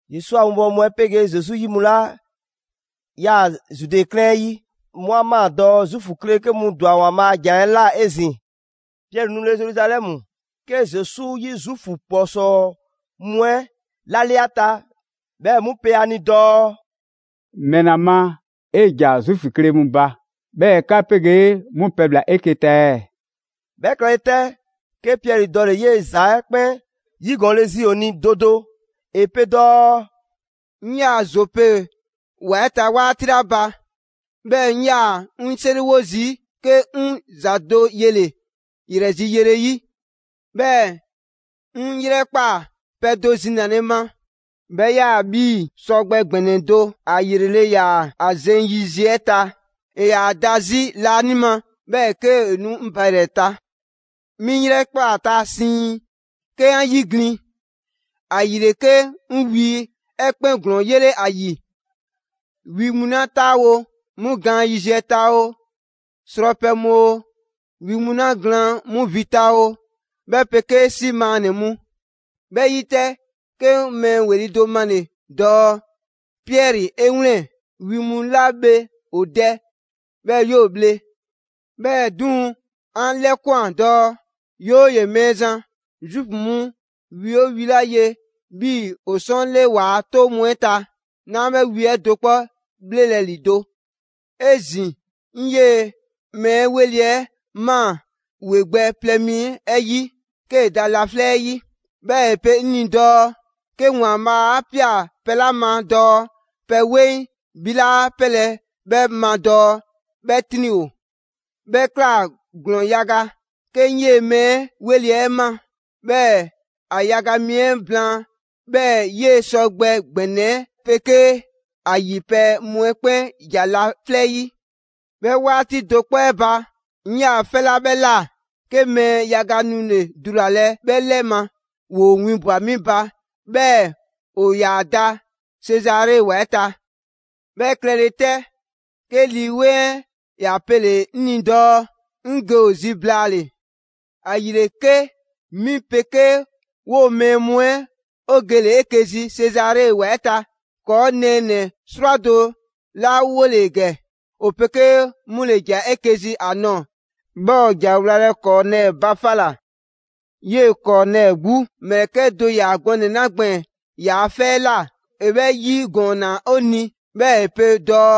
Zesu a winbɔwo mu 'ɛ 'pegee Zesu 'yi mu 'la 'yaa‑ Zude 'klɛɛn 'ɛ 'yi, 'mu 'a ꞊maa dɔɔ Zuufu kle 'ke mu ‑dwa ‑Waanbhaa' a ‑jan 'ɛ ꞊la 'ezin‑. Piɛri 'nule‑ Zeruzalɛmu, 'ke Zesu 'yi Zuufu ‑kpɔsɔɔ mu 'ɛ 'lale 'a ta, 'Bhɛɛ‑ 'mu pe ‑a ni dɔɔ: «‑Mɛla ma 'e ‑ja Zuufu kle mu ba, 'bhɛɛ‑ 'ka 'pegee 'mu pɛbhla‑ 'eke‑ ta ɛɛ?» 'Bhɛ klɛle 'tɛ, 'ke Piɛri dɔle‑ 'yee‑ ‑za 'ɛ 'kpɛn 'yigɔɔnle zi ‑o ni do do. ‑E pe dɔɔ: «'Ŋ 'yaa‑ Zope ‑wa 'ɛ ta 'waati 'la ba, 'bhɛɛ‑ 'ŋ 'yaa‑ 'ŋ 'seriwo zii', 'ke 'ŋ ‑za do yele‑ ‑yrɛ zi yele 'yi. 'Bhɛɛ‑ 'ŋ 'yrɛkpaa‑ pɛ do zinale ma, 'bhɛ 'yaa‑ 'bhii‑ sɔgbɛ ‑gbɛnɛ do: ‑a ‑yrele' ‑yaa ‑a zeŋ yiziɛ 'ɛ ta. ‑E ‑yaa da 'zi laanima 'bhɛɛ‑ 'kee‑ nu 'ŋ ba ‑yrɛ ta. 'Mi 'ŋ 'yrɛkpaa‑ ‑a ta siiŋ, 'ke 'an 'yiglin‑; ‑ayile 'ke 'ŋ wi 'ɛ 'kpɛn ‑glɔɔn 'yele ‑a ‑yi: wi mu 'la 'taawo‑ 'mu gaan yiziɛ ta oo, srɔpɛ mu oo, wi mu 'la glaan 'mu vi ta oo, 'bhɛ 'pegee 'si maannɛ‑ mu. 'Bhɛ 'yi 'tɛ, 'ke 'ŋ mɛɛ ‑weli' do male‑ dɔɔ: ‹Piɛri 'e 'wlɛn‑, wi mu 'la bhe ‑o dɛ, 'bhɛɛ‑ 'yoo‑ bhle!› 'Bhɛɛ‑ 'duŋ‑, 'an 'lɛkwan‑ dɔɔ: ‹'Yooye‑ Mɛɛzan, Zuufu mu wi 'oo wi 'la ye 'bhii‑ 'o 'sɔɔn 'le 'waa‑ 'toŋ mu 'ɛ ta, 'naa 'bhɛ wi 'ɛ do 'kpɔ 'bhlelɛ‑ ‑lido'›. 'Ezin‑ 'ŋ 'yee‑ mɛɛ ‑weli' 'ɛ ꞊maa ‑a ‑we gbɛ plɛ mi 'ɛ 'yi 'kee‑ da laflɛ' 'yi, 'bhɛɛ‑ ‑e pe 'ŋ ni dɔɔ: ‹'Ke ‑Waanbhaa' 'a ꞊pia pɛ 'la ma dɔɔ pɛ 'weŋ, 'bhi 'laa 'pelɛ‑ 'bhɛ ma dɔɔ 'bhɛ 'triŋ‑ ‑o›. 'Bhɛ ꞊kla ‑glɔɔn yaga 'ke 'ŋ 'yee‑ mɛɛ ‑weli' 'ɛ ma, 'bhɛɛ‑ ‑a yaga mi 'ɛ blaan, 'bhɛɛ‑ 'yee‑ sɔgbɛ ‑gbɛnɛ 'ɛ 'pegee ‑a ‑yi pɛ mu 'ɛ 'kpɛn ‑ja laflɛ' 'yi. 'Bhɛ 'waati do 'kpɔ 'ɛ ba, 'ŋ 'yaa‑ 'fɛ 'la 'bhɛ ꞊la, 'ke mɛɛ yaga nule‑ dulalɛ 'bhɛ 'lɛ ma; ‑woo winbwa‑ 'mi ba, 'bhɛɛ‑ ‑o ‑yaa da Sezare ‑wa 'ɛ ta. 'Bhɛ klɛle 'tɛ, 'ke Lii 'Weŋ 'ɛ ‑ya pele‑ 'ŋ ni dɔɔ 'ŋ ge ‑o zi blaale‑. ‑Ayile 'ke 'mi 'pegee 'woo‑ mɛɛ mu 'ɛ 'o gele‑ 'eke‑ zi Sezare ‑wa 'ɛ ta. ‑Kɔɔ' nɛɛnɛ‑ 'srwado‑ 'la 'wole‑ ‑gɛ, 'o 'pegee 'mu ‑le ‑ja 'eke‑ zi ‑a nɔɔ‑; 'bhɛɛ‑ 'o ‑ja wlalɛ Kɔɔnɛɛ ba 'fa ꞊la. 'Yee‑ Kɔɔnɛɛ 'gbu ‑mlɛkɛ' do ‑ya gɔnɛ‑ 'la gbɛɛn‑ ‑yaa' 'fɛ 'ɛ ꞊la, ‑e 'bhɛ 'yigɔɔnna 'o ni. 'Bhɛɛ‑ ‑e pe dɔɔ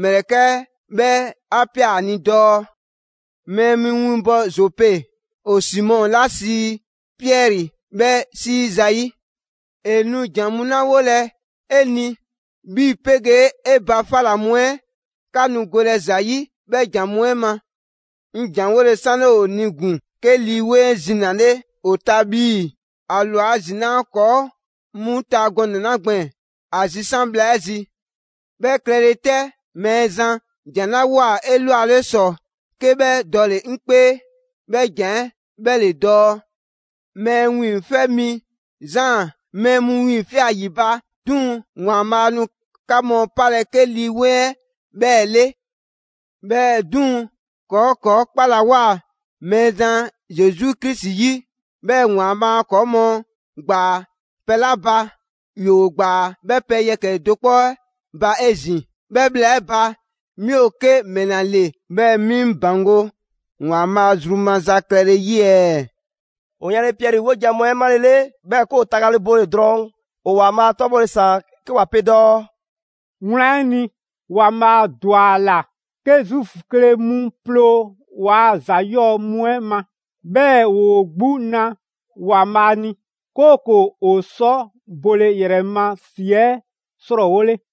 ‑mlɛkɛ' 'ɛ 'bhɛ 'a ꞊pia ‑a ni dɔɔ: ‹Mɛɛ mu winbɔ Zope, ‑o Simɔ 'la sii Piɛri 'bhɛ 'sii zayi'. ‑E nu ‑jan mu 'la 'wolɛ‑ 'e ni, 'bhi 'pegee 'e ba 'fa ꞊la mu 'ɛ 'ka nu golɛ ‑za 'yi 'bhɛɛ‑ ‑jan mu 'ɛ ma.› 'Ŋ ‑janwole 'sanle ‑o ni ‑gun, 'ke Lii 'Weŋ 'ɛ zinale ‑o ta 'bhii‑ ‑a ‑lwa ‑zinaa' ‑kɔɔ' mu ta gɔnɛ‑ 'la gbɛɛn‑ ‑a zisan' bhla 'ɛ zi. 'Bhɛ klɛle 'tɛ, Mɛɛzan ‑jan 'la ꞊woa 'elwale ‑sɔ 'ke 'bhɛ dɔle‑ 'ŋ 'kpee, 'bhɛ ‑jan 'ɛ 'bhɛ ‑le dɔɔ: ‹Mɛɛ Wiiŋfɛ' Mi Zaan mɛɛ mu 'wiiŋfia꞊ ‑yi ba, 'duŋ‑ ‑Waanbhaa' nu 'ka mu 'palɛ‑ 'ke Lii 'Weŋ 'ɛ 'bhɛɛ‑ 'le›. 'Bhɛɛ‑ 'duŋ‑, ‑kɔɔ' ‑kɔɔ' 'kpalawoa Mɛɛzan Zesu Krisi 'yi, 'bhɛɛ‑ ‑Waanbhaa' ‑kɔɔ' mu ‑gbaa pɛ 'la ba; ‑yoo ‑gbaa 'bhɛɛ‑ pɛ yɛkɛ‑ do 'kpɔ 'ɛ ba 'ezin‑. 'Bhɛ bhla 'ɛ ba, 'mi ‑o 'ke ‑mɛla ‑le 'bhɛɛ‑ 'mi 'ŋ ‑baŋgo' ‑Waanbhaa' zru maza klɛle 'yi ɛɛ?» ‑O yanle Piɛri 'wojan‑ mu 'ɛ 'malele, 'bhɛɛ‑ 'ke ‑o tagale bole‑; drɔɔn' ‑o ‑Waanbhaa' 'tɔbhɔle ‑saan 'ke ‑wa pe dɔɔ: «Wlan 'ɛ ni, ‑Waanbhaa' ‑dwa ‑a ‑la 'ke Zuufu kle mu ploo ‑waa ‑za 'yɔɔ‑ mu 'ɛ ma, 'bhɛɛ‑ ‑woo 'gbu na ‑Waanbhaa' ni, 'kooko‑ ‑o sɔ bole ‑yrɛ ma ‑si 'ɛ 'srɔɔwole.»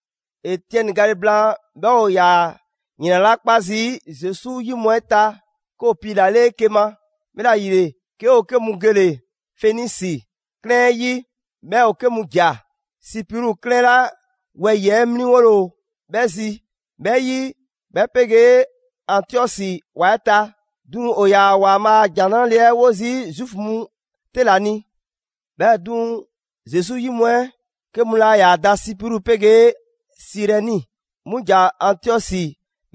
Etiɛni gale blaan, 'bhɛɛ‑ ‑o ‑yaa ‑yrɛn 'la 'kpa zii' Zesu 'yi mu 'ɛ ta, 'ke ‑o piilale 'eke‑ ma. 'Bhɛla‑ ‑yile, 'ke ‑o 'ke mu gele‑ Fenisi 'klɛɛn 'ɛ 'yi, 'bhɛɛ‑ ‑o 'ke ‑ja Sipru 'klɛɛn 'la 'ke wɛyi‑ 'mliŋgole ‑o 'bhɛ zi 'bhɛ 'yi, 'bhɛ 'pegee Antiɔsi ‑wa 'ɛ ta. 'Duŋ‑ ‑o ‑yaa ‑Waanbhaa a ‑Jan 'Nrale‑ 'ɛ 'wo zii' Zuufu mu 'te ‑la ni. 'Bhɛɛ‑ 'duŋ‑, Zesu 'yi mu 'ɛ 'kɛ mu 'la 'yaa‑ da Sipru 'pegee Sirɛni, 'mu ‑ja Antiɔsi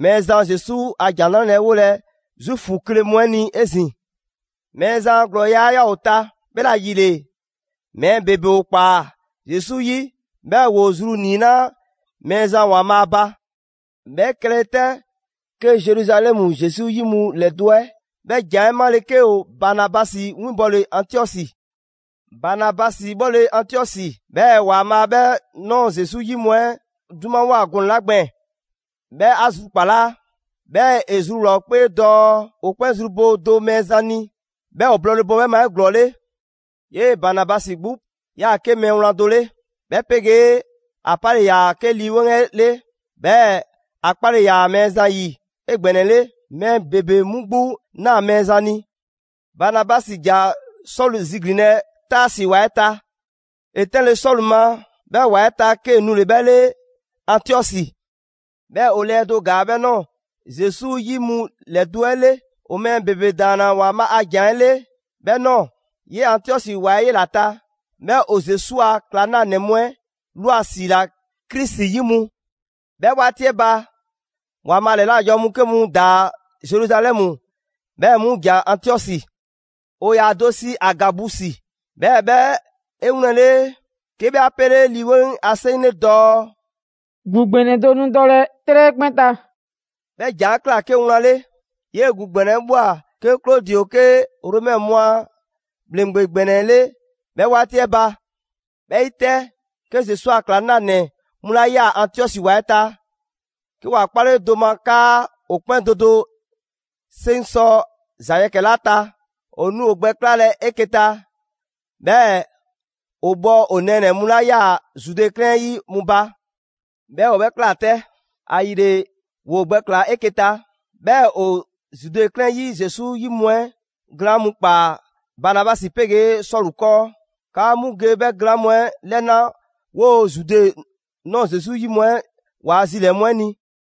Mɛɛzan Zesu a ‑Jan ‑Nrale' 'ɛ 'wolɛ‑ Zuufu kle mu 'ɛ ni 'ezin‑. Mɛɛzan a ‑glɔɔya' 'ɛ 'yaa‑ ‑o ta, 'bhɛla‑ ‑yile mɛɛ ‑bebe ‑o ꞊kpaa Zesu 'yi, 'bhɛɛ‑ ‑woo zru ‑niinaa' Mɛɛzan ‑Waanbhaa' ba. 'Bhɛ klɛle 'tɛ, 'ke Zeruzalɛmu Zesu 'yi mu ‑lɛdo' 'ɛ 'bhɛ ‑jan 'ɛ 'male, 'ke ‑o Banabasi winbɔle Antiɔsi. Banabasi 'bhɔle‑ Antiɔsi, 'bhɛɛ‑ ‑Waanbhaa' 'bhɛ ꞊nɔɔ Zesu 'yi mu 'ɛ 'dumawoa gɔnɛ‑ 'la gbɛɛn‑, 'bhɛ 'a zrukpalaa. 'Bhɛɛ‑ ‑e zruwlaa‑ ‑o 'kpee dɔɔ ‑o 'kpɛn zru bo do Mɛɛzan ni, 'bhɛɛ‑ ‑o blɔɔle bo 'bhɛ ma 'eglɔɔle. 'Yee‑ Banabasi 'gbu 'yaa‑ 'ke mɛɛ wlan do 'le, 'bhɛ 'pegee ‑a 'pale‑ ‑yaa 'ke Lii 'Weŋ 'ɛ 'le; 'bhɛɛ‑ ‑a 'kpale‑ ‑yaa Mɛɛzan 'yi 'egbɛnɛle. Mɛɛ ‑bebe 'mu 'gbu ꞊naa Mɛɛzan ni. Banabasi ‑ja Sɔlu ziglinlɛ Taasi ‑wa 'ɛ ta. ‑E 'tɛnle‑ Sɔlu ma 'bhɛ ‑wa 'ɛ ta, 'kee‑ nule‑ 'bhɛ 'le Antiɔsi. 'Bhɛɛ‑ ‑o lɛɛ do ‑gaa 'bhɛ ꞊nɔɔ Zesu 'yi mu ‑lɛdo' 'ɛ 'le. ‑O mɛɛ ‑bebe ‑daanna ‑Waanbhaa' a ‑jan 'ɛ 'le 'bhɛ ꞊nɔɔ. 'Yee‑ Antiɔsi ‑wa 'ɛ 'yela‑ ta, 'bhɛɛ‑ ‑o Zesu a ‑klaŋlanɛ mu 'ɛ ꞊lwa ‑siila ‹Krisi 'yi mu›. 'Bhɛ 'waati 'ɛ ba, ‑Waanbhaa' ‑lɛla' janwo mu 'ke mu ‑daa Zeruzalɛmu, 'bhɛɛ‑ 'mu ‑ja Antiɔsi. ‑O ‑yaa ‑o do sii Agabusi, 'bhɛɛ‑ 'bhɛ 'e 'wlɛnle‑, 'ke 'bhɛ 'a 'pele Lii 'Weŋ a 'seŋ 'le dɔɔ: «‑Gu ‑gbɛnɛ do nu dɔlɛ 'trɛ 'ɛ 'kpɛn ta.» 'Bhɛ ‑jan 'ɛ ꞊kla 'ke wlan 'le. 'Yee‑ ‑gu ‑gbɛnɛ 'ɛ ꞊bhwa 'ke Klodi ‑o 'ke Romɛ mu a ‑bhleŋgbe ‑gbɛnɛ 'le 'bhɛ 'waati 'ɛ ba. 'Bhɛ 'yi 'tɛ, 'ke Zesu a ‑klaŋlanɛ mu 'la 'yaa‑ Antiɔsi ‑wa 'ɛ ta, 'ke ‑wa 'kpale do ma 'kaa ‑o 'kpɛn do do 'seŋ sɔ ‑za yɛkɛ‑ 'la ta, ‑o nu ‑o gbɛ 'klalɛ‑ 'eke‑ ta, 'bhɛɛ‑ ‑o bhɔ ‑o nɛɛnɛ‑ mu 'la 'yaa‑ Zude 'klɛɛn 'ɛ 'yi 'mu ba. 'Bhɛɛ‑ ‑o 'bhɛ ꞊kla 'tɛ. ‑Ayile ‑woo gbɛklaa‑ 'eke‑ ta, 'bhɛɛ‑ ‑o Zude 'klɛɛn 'yi Zesu 'yi mu 'ɛ glaan' mu ‑kpaa Banabasi 'pegee Sɔlu 'kɔɔ, 'kaa 'mu ge 'bhɛ glaan' mu 'ɛ 'lɛna 'woo‑ Zude ꞊nɔɔ Zesu 'yi mu 'ɛ waa zilɛɛ‑ mu 'ɛ ni.